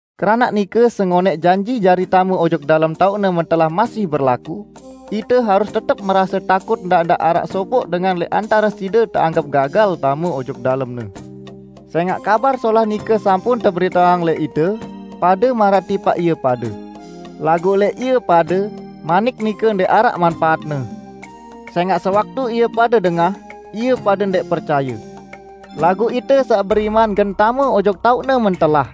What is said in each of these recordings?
Keranaq nike sengonẽq janji jari tame ojok dalem taoq-Ne mentelah masih berlaku, ite harus tetep merase takut ndaq-ndaq araq sopoq dengan lẽq antare side teanggep gagal tame ojok dalemne. Sẽngaq Kabar Solah nike sampun teberiteang lẽq ite, pade maraq tipaq ie pade. Laguq lẽq ie pade, manik nike ndẽq araq manpaatne. Sẽngaq sewaktu ie pade dengah, ie pade ndẽq percaye. Laguq ite saq beriman gen tame ojok taoq-Ne mentelah.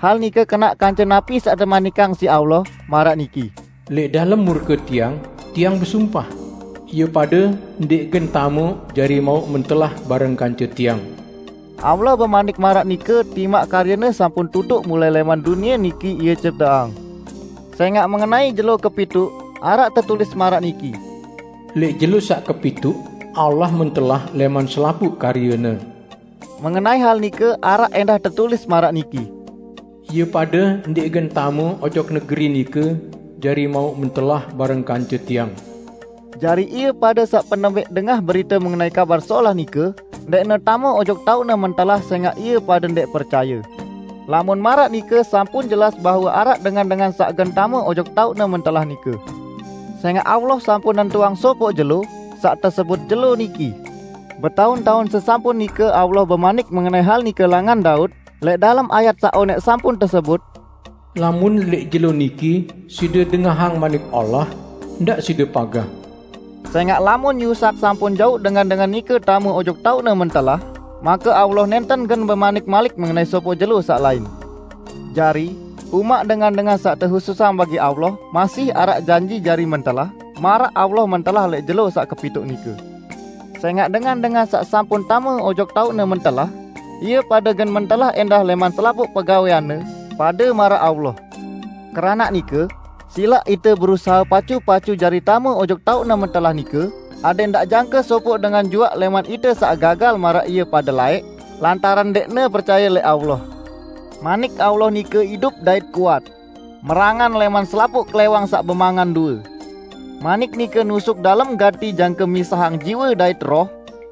Hal nike kenaq kance napi saq temanikang siq Allah, maraq niki, "Lẽq dalem murke Tiang, Tiang besumpah, 'Ie pade ndẽq gen tame ojok taoq Tiang mentelah.' " Allah bemanik maraq nike timaq karye-Ne sampun tutuq mulai lẽman dunie niki Ie cipteang. Sẽngaq mengenai jelo kepituq, araq tetulis maraq niki, "Lẽq jelo saq kepituq Allah mentelah lẽman selapuq karye-Ne." Mengenai hal nike araq ẽndah tetulis maraq niki, "Ie pade ndẽq gen tame ojok negeri nike jari mauq mentelah bareng kance Tiang." Jari ie pade saq penembẽq dengah berite mengenai Kabar Solah nike, ndẽqne tame ojok taoq-Ne mentelah sẽngaq ie pade ndẽq percaye. Lamun maraq nike sampun jelas bahwe araq dengan-dengan saq gen tame ojok taoq-Ne mentelah nike. Sẽngaq Allah sampun nentuang sopoq jelo, saq tesebut "Jelo Niki". Betaun-taun sesampun nike Allah bemanik mengenai hal nike langan Daud, lẽq dalem ayat saq onẽq sampun tesebut, "Lamun lẽq jelo niki side dengahang Manik Allah, ndaq side pagah." Sẽngaq lamun Yusak sampun jauq dengan-dengan nike tame ojok taoq-Ne mentelah, make Allah nẽnten gen bemanik malik mengenai sopoq jelo saq lain. Jari, umaq dengan-dengan saq tehususang bagi Allah masih araq janji jari mentelah maraq Allah mentelah lẽq jelo saq kepituq nike. Sẽngaq dengan-dengan saq sampun tame ojok taoq-Ne mentelah, ie pade gen mentelah ẽndah lẽman selapuq pegawẽanne, pade maraq Allah. Keranaq nike, silaq ite berusahe pacu-pacu jari tame ojok taoq-Ne mentelah nike, adẽq ndaq jangke sopoq dengan juaq lẽman ite saq gagal maraq ie pade laẽq, lantaran ndẽqne percaye lẽq Allah. Manik Allah nike idup dait kuat; merangan lẽman selapuq klẽwang saq bemangan due. Manik nike nusuk dalem gati jangke misahang jiwe dait roh;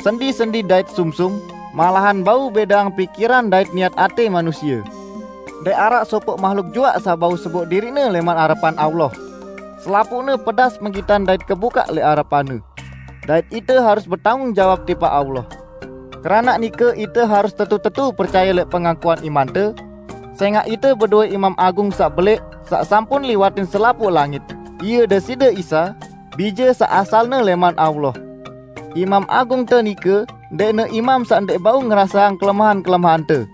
sendi-sendi dait sumsum, malahan bau bẽdeang pikiran dait niat atẽ manusie. Ndẽq araq sopoq mahluk juaq saq bau seboq diriqne lẽman arepan Allah. Selapuqne pedas penggitan dait kebukaq lẽq arepan-Ne. Dait ite harus betanggung jawab tipaq Allah. Keranaq nike ite harus tetu-tetu percaye lẽq pengakuan imante. Sẽngaq ite bedowẽ Imam Agung saq belẽq saq sampun liwatin selapuq langit, Ie Deside Isa, Bije saq asalne lẽman Allah. Imam Agungte nike ndẽqne imam saq ndẽq bau ngeraseang kelemahan-kelemahante.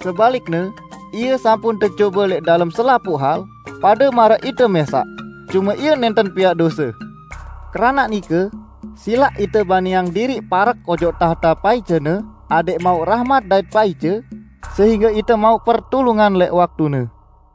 Sebalikne, Ie sampun tecobe lẽq dalem selapuq hal, pade maraq ite mẽsaq; cume Ie nẽnten piaq dose! Keranaq nike, silaq ite baniang diriq parek ojok tahte paice-Ne adẽq mauq rahmat dait paice, sehingge ite mauq pertulungan lẽq waktune.